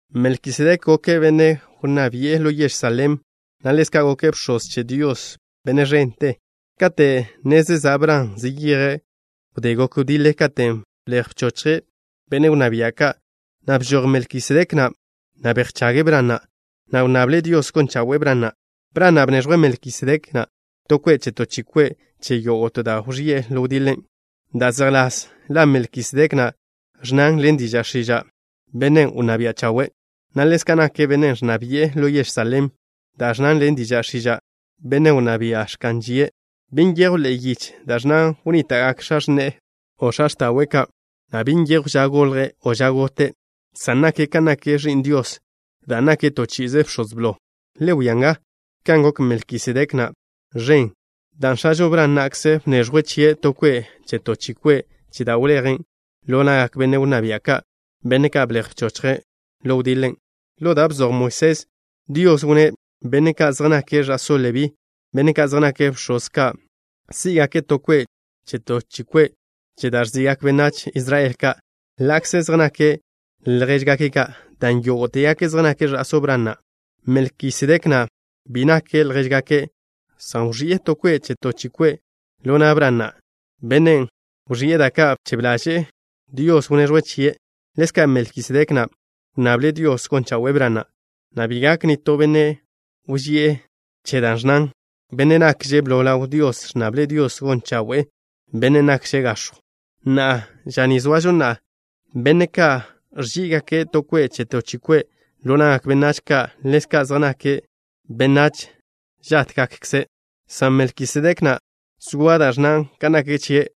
Melkisedek goke' benne' wnná bi'e ḻo yež Salem, na' ḻezka' goke' bx̱oz che Dios, Bennen' ẕente. Kate' ne zezá' Bran, zeyeje' wdé gok wdiḻe katen' blej bchochje' benne' wnná bia' ka', na' bžoj Melkisedek na', na' bejchage' Bran na', na' wnnable' Dios gon chawe'e Bran na'. Bran na' bneẕjwe' Melkisedek na' to kwe' che to chi kwe' che yógo'te da' wẕi'e ḻo wdiḻen'. Da' zejḻás la Melkisedek na' ẕnnan ḻen diža' x̱iža': “Benne' Wnná Bia' Chawe'” na' ḻezka' nake' benne' ẕnna bi'e ḻo yež Salem, da' ẕnnan ḻen diža' x̱iža': “Benne' Wnná Bia' Ẕka'n Žie'.” Bi nyejw ḻe'e yiche da' ẕnnan wnníta'gak x̱a x̱ne'e, o x̱a x̱ta'we' ka', na' bi nyejw ža golje' o ža gote', san nake' kan nak Ẕi'n Dios dan' nake' to chi'ize bx̱oz blo. Le wia nga, kan gok Melkisedek na' ẕen, dan' x̱ažo Bran na'kze bneẕjwe' chie' to kwe' che to chi kwe' che da' wlejen' ḻo na'gak benne' wnná bia' ka', benne' ka' blej bchochje' ḻo wdiḻen'. Ḻo da' bzoj Moisés, Dios wnné' benne' ka' zej nake' ẕa'só Lebí, benne' ka' zej nake' bx̱oz ka', sí'gake' to kwe' che to chi kwe' che da' ẕzi'gak benách Israel ka', ḻa'kze zej nake' ljéžgake' ka', dan' yógo'tegake' zej nake' ẕa'só Bran na'. Melkisedek na' bi nake' ljéžgake', san wẕi'e to kwe' che to chi kwe' ḻo na' Bran na', bennen' wẕi'e da' ka' bchebe ḻaže' Dios wneẕjwe' chie'. Ḻezka' Melkisedek na' wnnable' Dios gon chawe'e Bran na', na' bi gak nitó benne' wži'e che da' ẕnnan: “Bennen' nakže' blo ḻaw Dios ẕnnable' Dios gon chawe'e bennen' nakže' gax̱jw.” Na'a, ža ni zoažo na'a, benne' ka' ẕzí'gake' to kwe' che to chi kwe' ḻo na'gak benách ka' ḻezka' zej nake' benách žátgakkze', san Melkisedek na', zoa da' ẕnnan kan nak chie',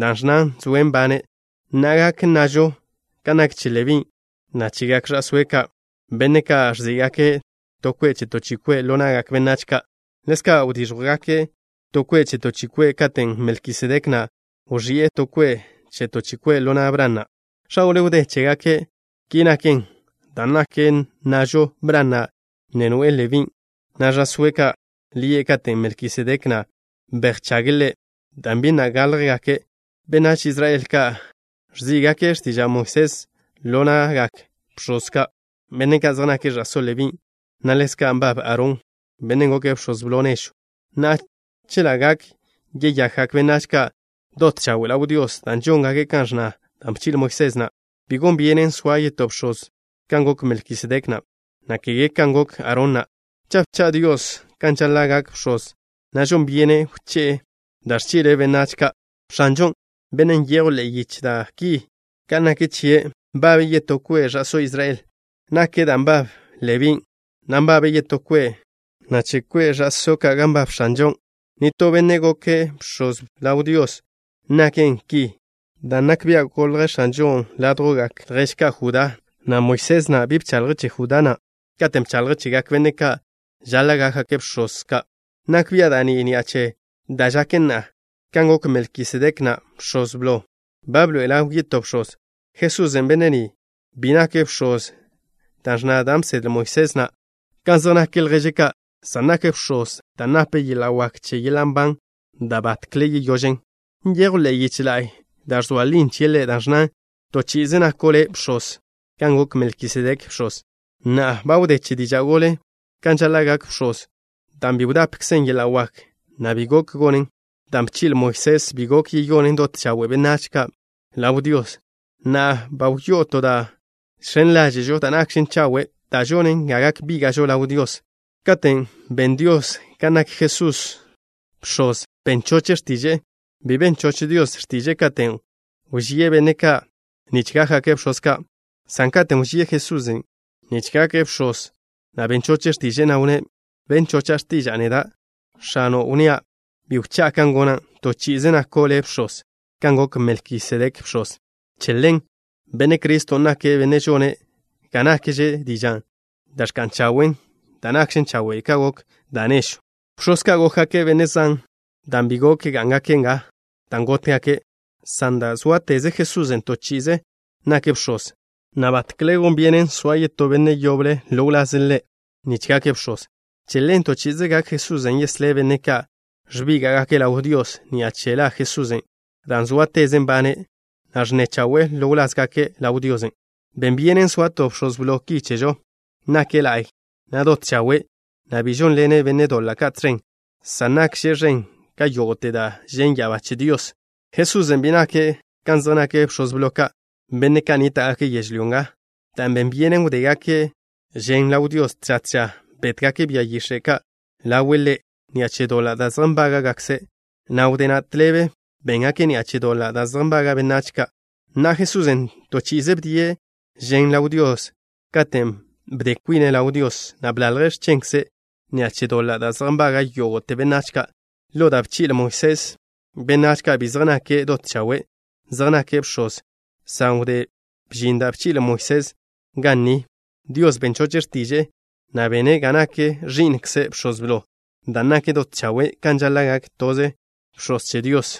da' ẕnnan zoe' nbane'. Na'a, gak nnažo kan nak che Lebí, na' chegak ẕa'sóe' ka', benne' ka' ẕzí'gake' to kwe' che to chi kwe' ḻo na'gak benách ka', ḻezka' wdíẕjwgake' to kwe' che to chi kwe' katen' Melkisedek na' wẕi'e to kwe' che to chi kwe' ḻo na' Bran na', x̱a gole wdé chégake'. Ki naken dan' gak nnažo Bran na' ne noe'e Lebín', na' ẕa'sóe' ka' ḻi'e katen' Melkisedek na' bejchage' ḻe', dan' bi na' gáḻjgake'. Benách Israel ka' ẕzí'gake' x̱tiža' Moisés ḻo na'gak bx̱oz ka', benne' ka' zej nake' ẕa'só Lebín', gan ḻezka' nbab Aarón, bennen' goke' bx̱oz blo nežw. Na'a, chela' gak yeyakgak benách ka' dot chawe' ḻaw Dios dan' žóngake' kan ẕnna da' bchi'le Moisés na', bi gon byenen soa yetó bx̱oz kan gok Melkisedek na', na' kege kan gok Aarón na'. Cha' bcha' Dios kan žaḻa' gak bx̱oz, na' žon byenen wché'e da' ẕchi'le' benách ka'. X̱anžon', Bennen' nyejw ḻe'e yiche da' ki kan nak chie', nbabe' yetó kwe' ẕa'só Israel ka naken da' nbab Lebín', na' che kwe' ẕa'só ka' gan nbab X̱anžon', nitó benne' goke' bx̱oz ḻaw Dios. Naken ki dan' nak bia' golj X̱anžon' ḻo kwe' ljež ka' Judá, na' Moisés na' bi bchaḻje' che Judá na' katen' bchaḻje' chegak benne' ka' žaḻa' gákgake' bx̱oz ka'. Nak bia' da' ni ni'a che da' žaken na'a. Kan gok Melkisedek na' bx̱oz, ba bḻoe'e ḻaw yetó Bx̱oz, Jesusen'. Benne' ni, bi nake' Bx̱oz dan' ẕnna da' bsedle Moisés na' kan zej nak lježe' ka', san nake' Bx̱oz dan' nape' yeḻa' wak che yeḻa' nban da' batkle yeyožen. Nyejw ḻe'e yiche la'y da' ẕzoa lin chie' Ḻe', da' ẕnnan: To chi'ize nako' Le' Bx̱oz kan gok Melkisedek bx̱oz. Na'a, ba wdé che diža' golen' ka žaḻa' gak bx̱oz, dan' bi wdapkzen yeḻa' wak, na' bi be gok gonen. Dan' bchi'le Moisés bi gok yeyonen dot chawe' benách ka' ḻaw Dios. Na'a, ba wyó'o to da' žx̱en ḻáže'žo da' nakžen chawe', da' žonen ga gak bíga'žo ḻaw Dios. Katen' ben Dios ga nak Jesusen' Bx̱oz, ben choche' x̱tiže'e. Bi ben choch Dios x̱tiže'e katen' wžíe' benne' ka' nich gákgake' bx̱oz ka', san katen' wžíe' Jesusen' nich gake' Bx̱oz, na' ben choche' x̱tiže'e, na' wnné': Ben chocha' x̱tiža'a neda', X̱ano', wnnía': “Bi wchá'a kan gona'. To chi'ize nako' Le' Bx̱oz kan gok Melkisedek bx̱oz.” Che ḻen, Benne' Criston' nake' Bennen' žone' ga nakkze dižan' da' ẕka'n chawe' dan' nakžen chawe' ka gok da' nežwn'. Bx̱oz ka' gókgake' benne' zan, dan' bi gok gá'ngake' nga dan' gótgake', san dan' zóateze Jesusen', to chi'ize nake' Bx̱oz, na' batkle gon byenen chaz no benne' latje chie' nich gake' bx̱oz. Che ḻen, to chi'ize gak Jesusen' yeslé' benne' ka' ẕbíga'gake' ḻaw Dios, ni'a che la Jesusen', dan' zóateze' nbane', na' ẕnne chawe'e ḻo wlázgake' ḻaw Diosen'. Ben byenen soa to Bx̱oz Blo ki chežo. Nake' la'y, na' dot chawe', na' bi žónḻene' benne' doḻa' ka' tẕen, san nakže' ẕen ka yógo'te da' žen' ya'abá che Dios. Jesusen' bi nake' kan zej nak bx̱oz blo ka', benne' ka' nníta'gake' yežlyó nga, dan' ben byenen wdégake' žen ḻaw Dios tža tža. Bétgake' bia yix̱e' ka' ḻawe' Ḻe' ni'a che doḻa' da' zej nbága'kze', na' wdé na' tḻebe béngake' ni'a che doḻa' da' zej nbaga' benách ka'. Na'a, Jesusen', toze chi'i bdie' žen ḻaw Dios, katen' bde kwine' ḻaw Dios, na' bḻalje' x̱chenkze' ni'a che doḻa' da' zej nbaga' yógo'te benách ka'. Ḻo da' bchi'le Moisés, benách ka' bi zej nake' dot chawe', zej nake' bx̱oz, san wdé bžin da' bchi'le Moisés ga ni, Dios ben choche' x̱tiže'e, na' bene' ga nak Ẕi'nkze' Bx̱oz Blo, dan' nake' dot chawe' kan žaḻa' gak to bx̱oz che Dios.